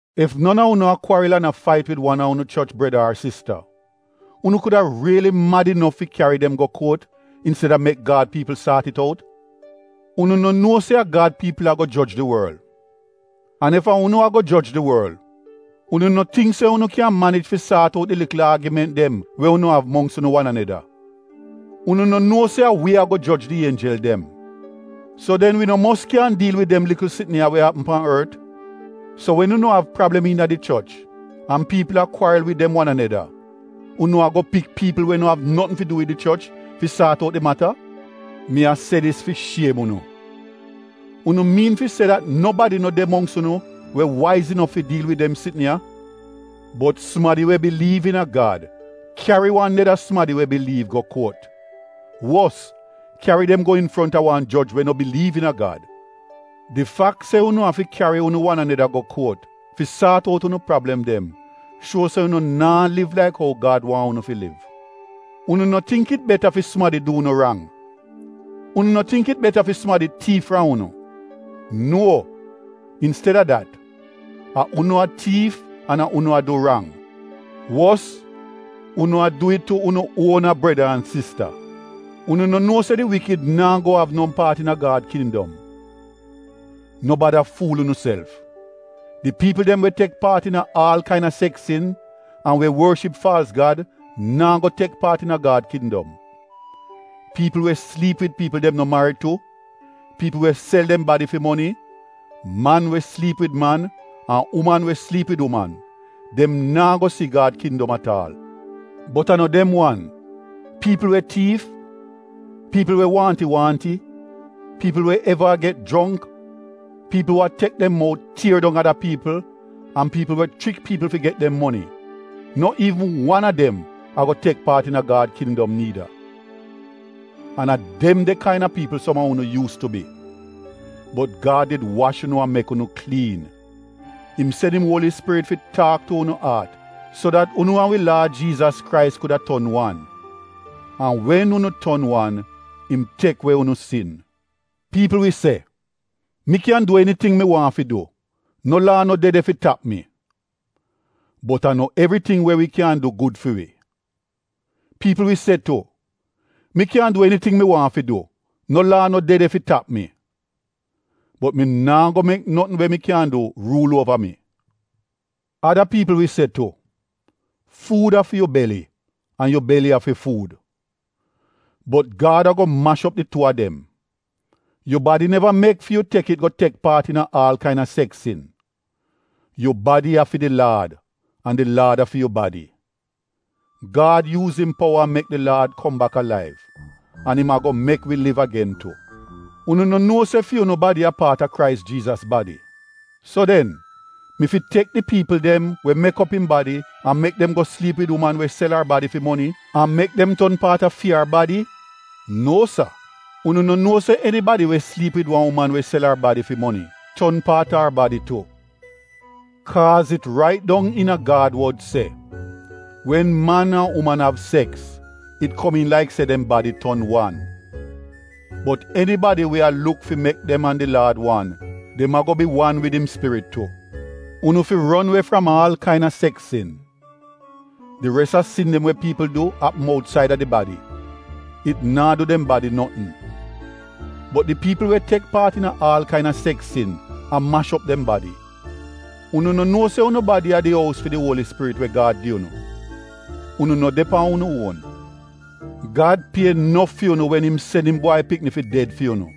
Ef non a unu a kwaril an a fait wid wan a unu choch breda ar sista unu kuda riili mad inof fi kyari dem go kuot insteda mek Gad piipl saat it out? Unu no nuo se a Gad piipl ago joj di worl? An ef a unu ago joj di worl, unu no tingk se unu kyan manij fi saat out di likl aagiment dem we unu av mongks unu wan aneda? Unu no nuo se a wi ago joj di ienjel dem? So den wi no mos kyan diil wid dem likl sitn ya we apm pan ort? So wen unu av prablem iina di choch an piipl a kwaril wid dem wan aneda, unu ago pik piipl we no av notn fi du wid di choch fi saat out di mata? Mi a se dis fi shiem unu. Unu miin fi se dat nobadi no de mongks unu we waiz inof fi diil wid dem sitn ya? Bot sumadi we biliiv iina Gad kyari wan neda sumadi we biliiv go kuot — wos kyari dem go infronta wan joj we no biliiv iina Gad. Di fak se unu afi kyari unu wan aneda go kuot fi saat out unu prablem dem shuo se unu naa liv laik ou Gad waahn unu fi liv. Unu no tingk it beta fi sumadi du unu rang? Unu no tingk it beta fi sumadi tiif fram unu? Nuo, insteda dat, a unu a tiif an a unu a du rang — wos unu a du it tu unu uona breda an sista. Unu no nuo se di wikid naa go av no paat iina Gad kindom? No bada fuul unuself! Di piipl dem we tek paat iina aal kaina seks sin an we worship faalz gad naa go tek paat iina Gad kindom. Piipl we sliip wid piipl dem no marid tu, piipl we sel dem badi fi moni, man we sliip wid man an uman we sliip wid uman, dem naa go si Gad kindom at aal. Bot a no dem wan, piipl we tiif, piipl we waahnti-waahnti, piipl we eva a get jrongk, piipl we tek dem mout tier dong ada piipl an piipl we chrik piipl fi get dem moni, no iivn wan a dem ago tek paat iina Gad Kindom niida. An a dem de kaina piipl som a unu yuus tu bi. Bot Gad did wash unu an mek unu kliin. Im sen im Uoli Spirit fi taak tu unu aat so dat unu an wi Laad Jiizas Krais kuda ton wan. An wen unu ton wan, im tek we unu sin. Piipl wi se, “Mi kyan du eniting mi waahn fi du, no laa no de de fi tap mi,” — bot a no evriting we wi kyan du gud fi wi. Piipl wi se tu, “Mi kyan du eniting mi waahn fi du, no laa no de de fi tap mi,” — bot mi naa go mek notn we mi kyan du ruul uova mi. Ada piipl wi se tu, “Fuud a fi yu beli an yu beli a fi fuud,” — bot Gad ago mash op di tuu a dem. Yu badi neva mek fi yu tek it go tek paat iina aal kaina seks sin. Yu badi a fi di Laad an di Laad a fi yu badi. Gad yuuz im powa an mek di Laad kom bak alaiv, an im ago mek wi liv agen tu. Unu no nuo se fi unu badi a paat a Krais Jiizas badi. So den mi fi tek di piipl dem we mek op im badi an mek dem go sliip wid uman we sel ar badi fi moni — an mek dem ton paat a fi ar badi? Nuo sa! Unu no nuo se enibadi we sliip wid wan uman we sel ar badi fi moni, ton paat ar badi tu? Kaaz it rait dong iina Gad wod se, “Wen man an uman av seks, it komiin laik se dem badi ton wan.” Bot enibadi we a luk fi mek dem an di Laad wan, dem ago bi wan wid im spirit tu. Unu fi ron we fram aal kaina seks sin. Di res a sin dem we piipl du apm outsaida di badi — it naa du dem badi notn. Bot di piipl we tek paat iina aal kaina seks sin a mash op dem badi. Unu no nuo se unu badi a di ous fi di Uoli Spirit we Gad gi unu? Unu no de pan unu uon. Gad pie nof fi unu wen im sen im Bwai Pikni fi ded fi unu.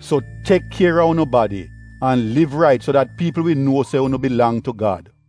So tek kier a unu badi an liv rait so dat piipl wi nuo se unu bilang tu Gad.